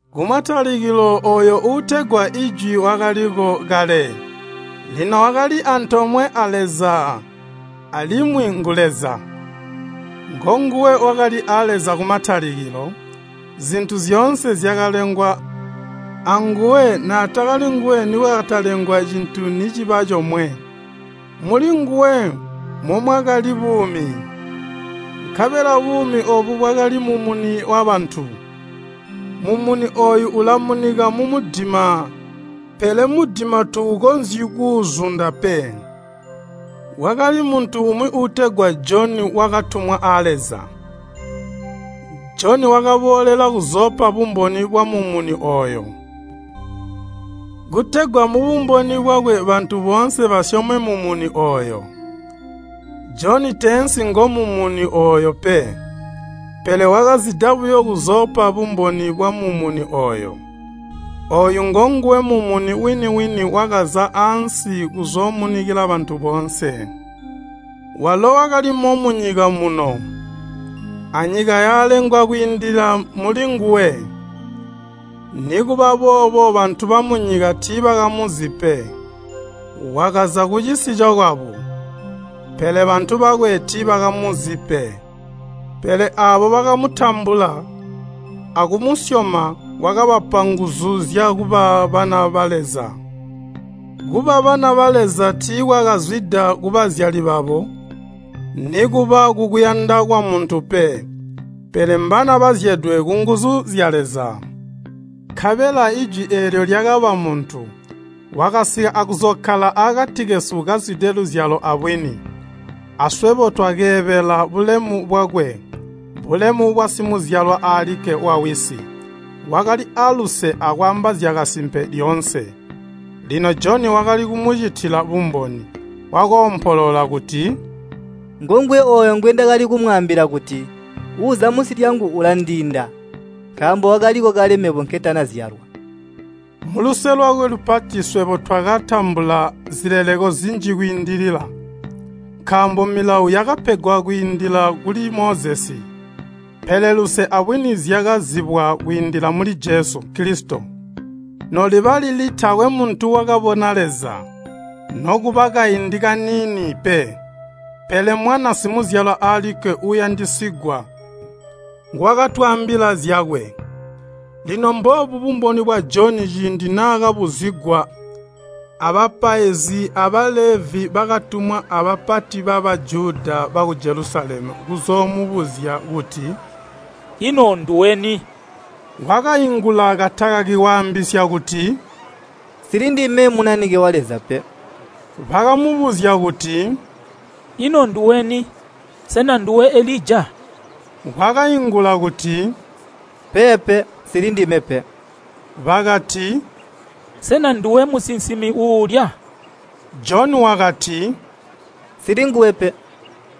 Kumatalikilo ooyo uutegwa Jwi wakaliko kale. Lino wakali aantoomwe a Leza, alimwi ngu Leza. Ngonguwe wakali a Leza kumatalikilo, zintu zyoonse zyakalengwa anguwe naatali nguwe nikwatakalengwa cintu niciba comwe. Muli nguwe momwakali buumi, nkabela buumi oobu bwakali mumuni wabantu. Mumuni ooyu ulamunika mumudima, pele mudima tuukonzyi kuuzunda pe. Kwakali muntu umwi uutegwa Joni wakatumwa a Leza. Joni wakaboolela kuzoopa bumboni bwa Mumuni ooyu, kutegwa mubumboni bwakwe bantu boonse basyome Mumuni. Joni teensi ngo Mumuni, pele wakazida kuzoopa bumboni bwa Mumuni. Ooyu ngonguwe Mumuni wini-wini wakaza ansi kuzoomunikila bantu boonse. Walo wakalimo munyika muno, nyika yakalengwa kwiindila muli nguwe, nikuba boobo bantu bamunyika tiibakamuzi pe. Wakaza kucisi cokwabo, pele bantu bakwe tiibakamutambula. Pele aabo bakamutambula akumusyoma wakabapa nguzu zyakuba bana ba Leza. Kuba bana ba Leza tiikwakazwida kubazyali babo, nikuba kukuyanda kwamuntu, pele mbana bazyedwe kunguzu zya Leza. Nkabela Jwi eelyo lyakaba muntu, wakasika kuzookkala akati kesu kazwide luzyalo abwini. Swebo twakeebela bulemu bwakwe, bulemu bwa Simuzyalwa alikke wa Wisi. Wakali aaluse akwaamba zyakasimpe lyoonse. Joni wakali kumucitila bumboni. Wakoompolola kuti, “Ngonguwe ooyu ngwendakali kumwaambila kuti, ‘Uuza munsi lyangu ulandiinda, nkaambo wakaliko kale mebo nketanazyalwa!’” Muluse lwakwe lupati swebo twakatambula zileleko zinji kwiindilila. Milawo yakapegwa kwiindila muli Mozesi, pele luse abwini zyakazibwa kwiindila muli Jesu Kilisito. Noliba lili taakwe muntu wakabona Leza, nokuba kaindi kaniini buyo Mwana Simuzyalwa alikke uuyandisigwa nguwakatwaambila zyakwe. Mboobu bumboni bwa Joni ciindi naakabuzigwa abapaizi a Balevi bakatumwa abapati ba Bajuda baku Jelusalemu kuzoomubuzya kuti, “Ino nduweni?” Wakaingula katakaki waambisya kuti, “Nsili ndime Munanike wa Leza pe.” Bakamubuzya kuti, “Ino nduweni? Sena nduwe Elija?” Wakaingula kuti, “Peepe, nsili ndime nguwe.” Bakati, “Sena nduwe Musinsimi uuyooboola?” Joni wakati, “Nsili nguwe.”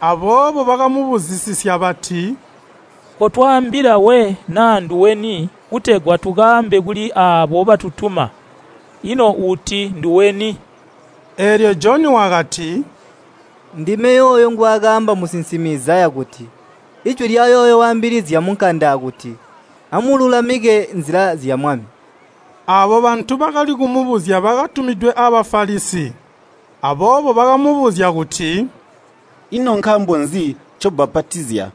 Nkaako bakamubuzisisya bati, “Kotwaambila we naa nduweni kutegwa tukaambe kuli aabo batutuma. Ino uti nduweni?” Joni wakati, “Ndime yooyo ngwaakaamba musinsimi Izaya kuti, ‘Kuli waambilizya munkanda kuti, Amululamike nzila zya Mwami!’” Aabo bantu bakali kumubuzya bakatumidwe a Bafalisi. Alimwi bakamubuzya kuti, “Ino nkaambo nzi ncobbapatizya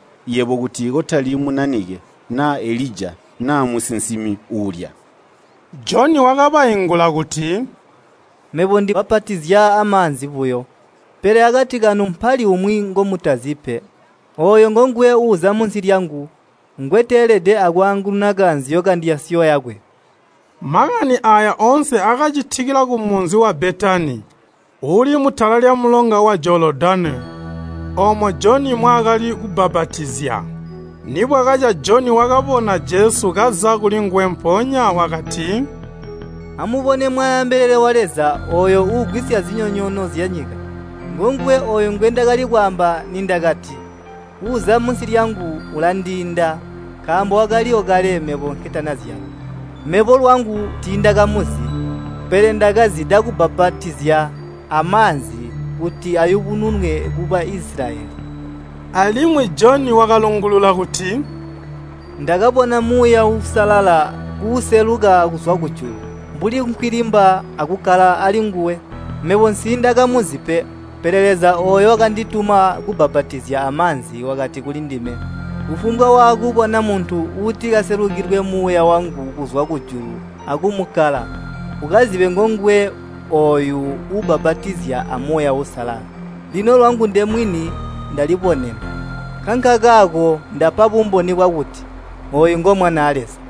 kuti kotali Munanike, naa Elija, naa musinsimi uuyooboola?” Joni wakabaingula kuti, “Mebo ndibbapatizya amaanzi buyo. Pele akati kanu mpali umwi ngomutazi. Ooyo ngonguwe uuza munsi lyangu, ngonguwe ngweteelede akwaangununa kaanzyo kandyasyo yakwe.” Makani aaya oonse akacitikila kumunzi wa Betani, uuli mutala lyamulonga wa Jolodani, oomo Joni mwaakali kubbapatizya. Nibwakaca Joni wakabona Jesu kaza kulinguwe, mpoonya wakati, “Amubone Mwanaa Mbelele wa Leza, uugwisya zinyonyoono zyanyika! Ngonguwe ngwendakali kwaamba nindakati, ‘Uuza munsi lyangu ulandiinda, nkaambo wakaliwo kale mebo nketanazyalwa.’ Mebo lwangu tiindakamuzi, pele ndakazida kubbapatizya amaanzi kuti ayubununwe ku Baisilayeli.” Alimwi Joni wakalungulula kuti, “Ndakabona Muuya Uusalala kuuseluka kuzwa kujulu mbuli nkwilimba akukkala ali nguwe. Mebo nsiindakamuzi, pele Leza wakandituma kubbapatizya amaanzi wakati kulindime, ‘Kufumbwa waakubona muntu uutikaselukilwe Muuya wangu kuzwa kujulu akumukkala, ukazibe kuti ngonguwe ooyo uubbapatizya a Muuya Uusalala.’ Lino lwangu ndemwini ndalibonena, nkankakaako ndapa bumboni bwakuti, ‘Ooyu ngo Mwanaa Leza!’”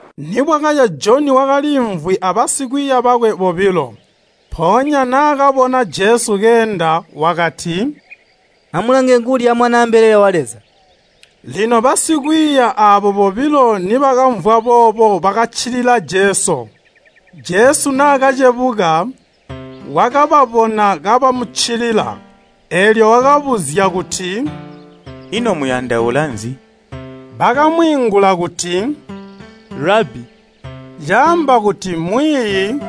Nibwakaca Joni wakaliimvwi abasikwiiya bakwe bobilo, Naakabona Jesu keenda wakati, “Amulange nguulya Mwanaa Mbelele wa Leza.” Basikwiiya bobilo aabo nibakamvwa boobo bakaccilila Jesu. Jesu naakacebuka, wakababona kabamuccilila, eelyo wakabuzya kuti, “Ino muyandaula nzi?” Bakamwiingula kuti, “Rabbi, ino ukkala kuli?” (“Rabbi,” caamba kuti, “Mwiiyi.”)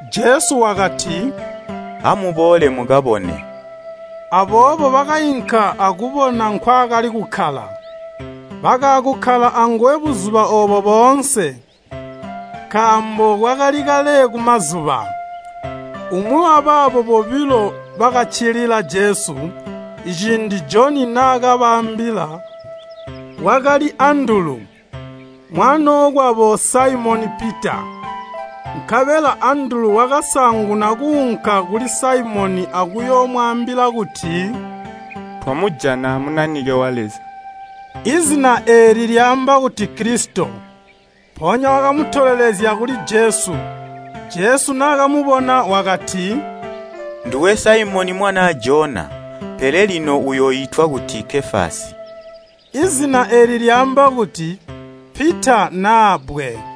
Jesu wakati, “Amuboole mukabone.” Aboobo bakainka akubona nkwaakali kukkala. Bakaakukkala anguwe buzuba oobo boonse, nkaambo kwakali kale kumazuba. Umwi wabaabo bakaccilila Jesu, ciindi Joni naakabaambila, wakali Andulu, mwanookwabo Saimoni Pita. Nkabela Andulu wakasaanguna kuunka kuli Saimoni akuyoomwaambila kuti, “Twamujana Munanike wa Leza.” (Zina eeli lyaamba kuti Kilisito.) Andulu wakatolelezya Saimoni kuli Jesu. Jesu nakamubona wakati, “Nduwe Saimoni mwanaa Jona, kuzwa ono unooitwa kuti Kefasi.” (Zina eeli lyaamba kuti, Pita naa bbwe.)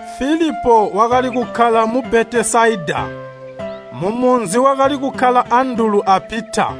Filipo wakali kukkala mu Betesaida. Mumunzi wakali kukkala Andulu a Pita.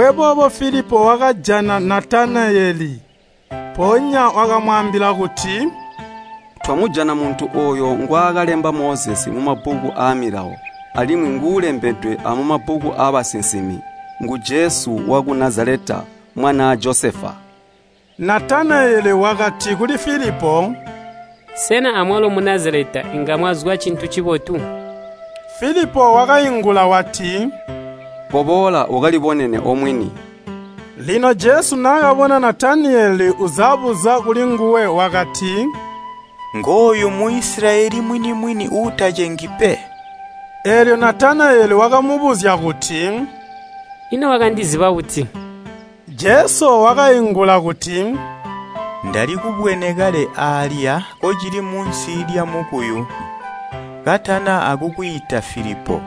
Filipo wakajana Natanayeli, mpoonya wakamwaambila kuti, “Twamujana muntu Mozesi ngwaakalemba mumabbuku aamilawo, ngonguwenya uulembedwe amumabbuku aabasinsimi, ngu Jesu waku Nazaleta, mwanaa Josefa.” Natanayeli wakati kuli Filipo, “Sena amwalo mu Nazaleta inga mwazwa cintu cibotu?” Filipo wakaingula wati, “Koboola, ukalibonene omwini.” Lino Jesu naakabona Natanayeli uzabuza kulinguwe, wakati, “Ngooyu Muisilayeli mwini-mwini, uutacengi!” Natanayeli wakabuzya kuti, “Ino wakandiziba buti?” Jesu wakaingula kuti, “Ndalikubwene kale kocili munsi lyamukuyu, katana akukwiita Filipo.”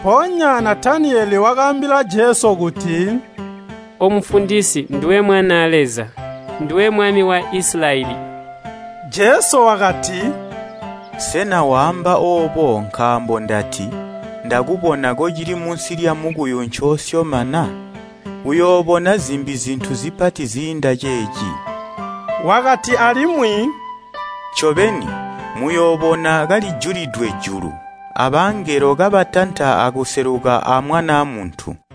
Mpoonya Natanayeli wakaambila Jesu kuti, “O Mufundisi, nduwe Mwanaa Leza! Nduwe Mwami wa Isilayeli!” Jesu wakati, “Sena wasyoma oobo nkaambo ndati, ‘Ndakubona kocili munsi lyamukuyu?’ Uyoobona zintu zimbi zipati ziinda ceeci.” Wakati alimwi, “Ncobeni, muyoobona julu kalijulidwe, abangelo kabatanta akuseluka aa Mwanaa Muntu.”